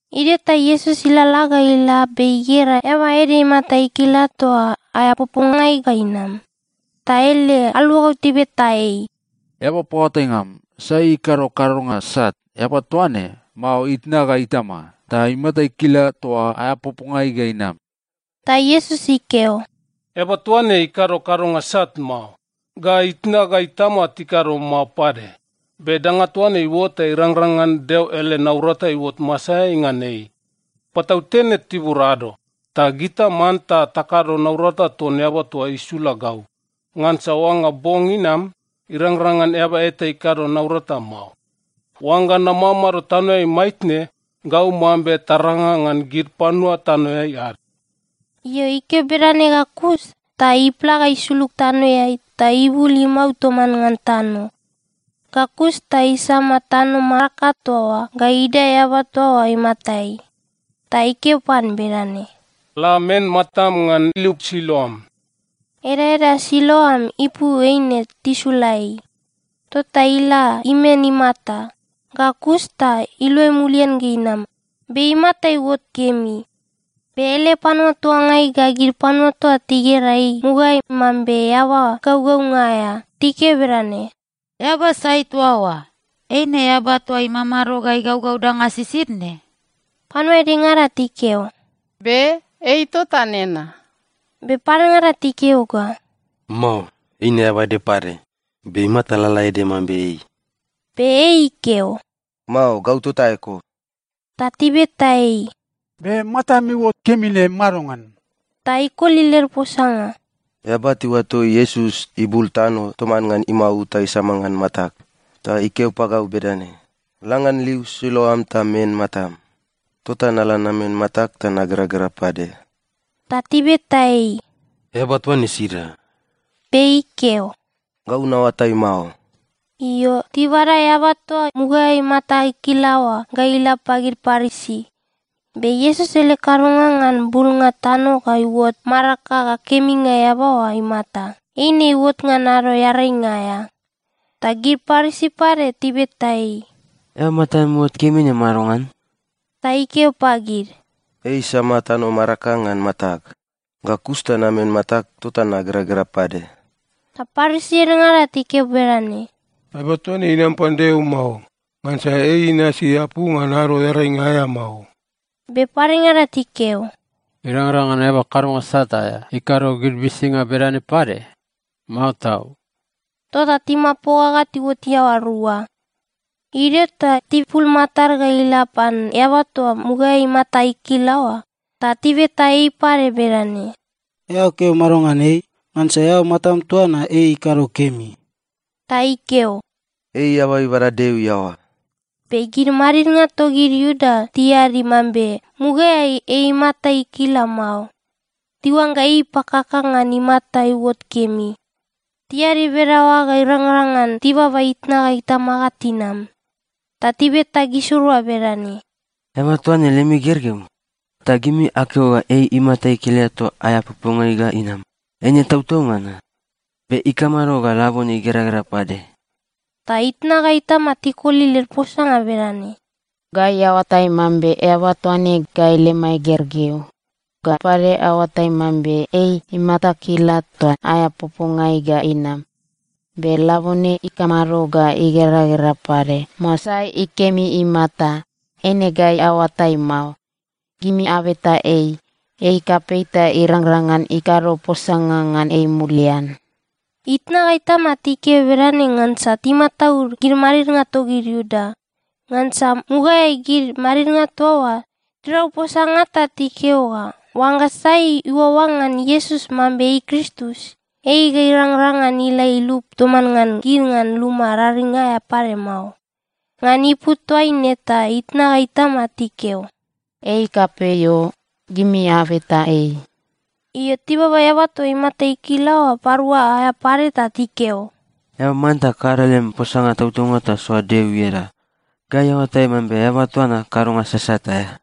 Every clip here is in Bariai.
Idio ta Iesus ilalala ga ila be igera eaba ede imata ikila toa aea popongai ga inam. Ta ele aluagau tibeta ei, “Eaba paoatainga am, sai ikado kadonga sat, eaba toa ne, mao itna ga itama, ta imata ikila toa aea popongai ga inam?” Ta Iesus ikeo, “Eaba toa ne ikado kadonga sat mao, ga itna ga itama tikado mao pade. Be danga toa ne iuot ta irangrang ngan Deo ele naurata iuot masaeai ngan ei. Patautene tibur ado, ta gita manta takado naurata ton Eaba toa isula gau. Ngansa oangga bong inam, irangrang ngan eaba eta ikado naurata mao. Oangga namamado tanoeai maitne, gau mambe taranga ngan gid panua tanoeai ad.” Io, ikeo bedane ga kus, ta ipla ga isulug tanoeai, ta ibul imau toman ngan tano. Ga kus ta isama tano maraka toa oa ga idae eaba toa oa imatai. Ta ikeo pan bedane, “La men matam ngan liu Siloam.” (Edaeda Siloam ipu eine “Tisula ei.”) Tota ila imen imata, ga kus ta iluai mulian ga inam, be imata iuot kemi. Be ele panua tuangai ga gid panua toa tigera ei mugaeai mambe eaba gaugaunga aea, tikeo bedane, “Eaba sai toa oa? Eine eaba toa imamado ga igaugau danga sisid ne?” Panua edengada tikeo, “Be. Ei tota nena.” Be padengada tikeo ga, “Mao. Eina eaba ede pade, be imata lalaede mambe ei.” Be ei ikeo, “Mao. Gau tota eko!” Ta tibeta ei, “Be matam iuot kemi ne madongan?” Ta ikoli led posanga, “Eaba tiuato Iesus ibul tano toman ngan imau ta isama ngan matag, ta ikeo pagau bedane, ‘La ngan liu Siloam ta men matam.’ Tota nala namen matag ta nageragera pade!” Ta tibeta ei, “Eaba toa ne sida?” Be ikeo, “Gau naoatai mao.” Io, tibada eaba toa mugaeai imata ikila oa ga ila pagid Parisi. Be Iesus ele kadonga ngan bulnga tano ga iuot maraka ga keminga eaba oa imata, eine iuot ngan Ado Earainga aea. Ta gid Parisi pade tibeta ei, “Eao matam iuot kemi ne madongan?” Ta ikeo pagid, “Ei isama tano maraka ngan matag, ga kus ta namen matag, tota nageragera pade.” Ta Parisi edengada tikeo bedane, “Eaba toa ne inam pan Deo mao, ngansa ei inasi apu ngan Ado Earainga aea mao.” Be padengada tikeo, “Irangrang ngan eaba kadonga sat aea ikado gid uisinga bedane pade? Mao tau!” Tota timapoga ga tiuot iaoa rua. Idio ta tipul matad ga ila pan eaba toa mugaeai imata ikila oa, ta tibeta ei pade bedane, “Eao keo mado ngan ei? Ngansa eao matam toa na ei ikado kemi.” Ta ikeo, “Ei eaba ibada Deo iaoa.” Be gid madidnga togid Iuda tiadi mambe mugaeai ei imata ikila mao. Tiuangga ei ipakaka ngan imata iuot kemi. Tiadi bedaoa ga irangrang ngan tibaba itna ga itama ga tinam. Ta tibeta gisirua bedane, “Eaba toa ne lemi gergeu? Ta gimi akeo ga ei imata ikila toa aea popongai ga inam, eine tautaunga na? Be ikamado ga labone igeragera pade?” Ta itna ga itama tikoli led posanga bedane, “Gai aoatai mambe eaba toa ne gai lemai gergeu. Ga pade aoatai mambe ei imata ikila toa aea popongai ga inam. Be labone ikamado ga igeragera pade, mao sai ikemi imata, eine gai aoatai mao. Gimi abeta ei. Ei kapei ta irangrang ngan ikado posanga ngan ei mulian.” Itna ga itama tikeo bedane ngansa timataud gid madidnga togid Iuda. Ngansa mugaeai gid madidnga toa oa tirau posanga ta tikeo ga oangga sai iuaoa ngan Iesus mambe ei Kristus, ei ga irangrang ngan ila ilup toman ngan gid ngan luma raring aea pade mao. Ngan ipu toaine ta itna ga itama tikeo, “Ei kapei o. Gimi abeta ei.” Io, tibaba eaba toa imata ikila oa parua aea pade ta tikeo, “Eao manta kado lem posanga tautaunga ta soa Deo ieda. Gai aoatai mambe eaba toa na kadonga sasat aea.”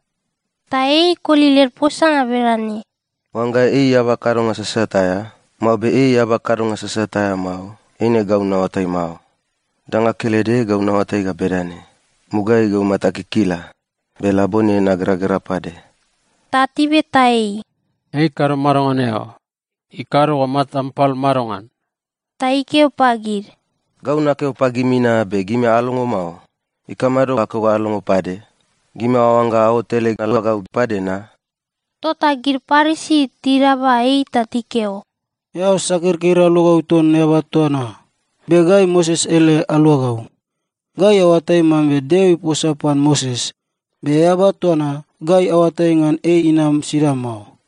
Ta ei ikoli led posanga bedane, “Oangga ei eaba kadonga sasat aea, mao be ei eaba kadonga sasat aea mao, eine gau naoatai mao. Danga kelede gau naoatai ga bedane: Mugaeai gau matag ikila, be labone nageragera pade.” Ta tibeta ei, “Ei ikado mado ngan eao? Ikado ga matam pal madongan?” Ta ikeo pagid, “Gau nakeo pagimi na, be gimi alongo mao. Ikamado akeo ga alongo pade? Gimi aoangga aot ele aluagau pade na?” Tota gid Parisi tidaba ei ta tikeo, “Eao sakirkir, aluagau ton eaba toa na! Be gai Moses ele aluagau. Gai aoatai mambe Deo iposa pan Moses. Be eaba toa na, gai aoatai ngan ei inam sida mao.”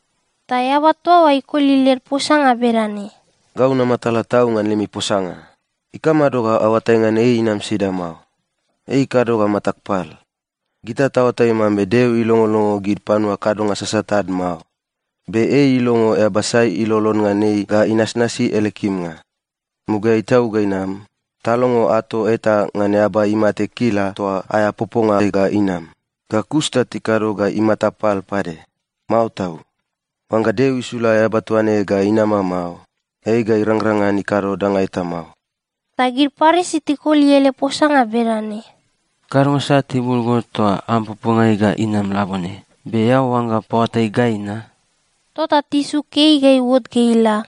Ta eaba toa oa ikoli led posanga bedane, “Gau namatala tau ngan lemi posanga! Ikamado ga aoatai ngan ei inam sida mao? Ei ikado ga matag pal! Gita taoatai mambe Deo ilongolongo gid panua kadonga sasat ad mao. Be ei ilongo eaba sai ilolon ngan ei ga inasnasi ele kimnga. Mugaeai tau ga inam, talongo ato eta ngan eaba imata ikila toa aea popongai ga inam, ga kus ta tikado ga imata pal pade? Mao tau! Oangga Deo isula eaba toa ne ga inama mao, ei ga irangrang ngan ikado danga eta mao.” Ta gid Parisi tikoli ele posanga bedane, “Kadonga sat ibul go toa am popongai ga inam labone! Be eao oangga paoatai gai na?” Tota tisuk ei ga iuot ga ila.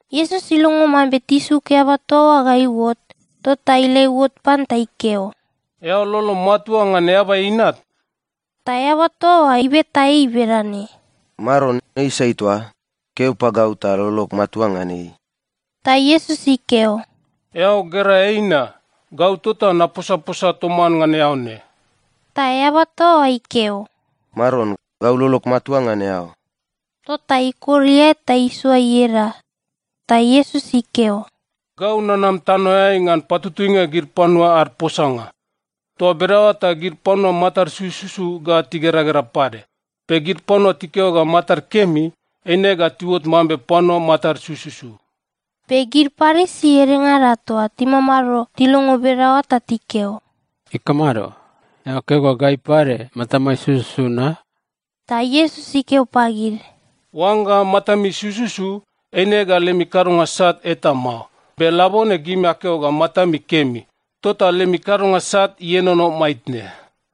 Iesus ilongo mambe tisuk eaba toa oa ga iuot. Tota ila iuot pan ta ikeo, “Eao lolom matua ngan Eaba Inat?” Ta eaba toa oa ibeta ei bedane, “Maron, ei sai toa? Keo pagau ta lolog matua ngan ei.” Ta Iesus ikeo, “Eao gera ei na. Gau tota naposaposa toman ngan eao ne.” Ta eaba toa oa ikeo, “Maron, gau lolog matua ngan eao.” Tota ikor iae ta isoa ieda. Ta Iesus ikeo, “Gau nanam tanoeai ngan patutuinga gid panua ad posanga. Toa bedaoa ta gid panua matad sususu ga tigeragera pade, be gid panua tikeo ga matad kemi, eine ga tiuot mambe panua matad sususu.” Be gid Parisi edengada toa timamado, tilongo bedaoa ta tikeo, “Ikamado? Eao keo ga gai pade matamai sususu na?” Ta Iesus ikeo pagid, “Oangga matami sususu, eine ga lemi kadonga sat eta mao. Be labone gimi akeo ga matami kemi, tota lemi kadonga sat ienono maitne.”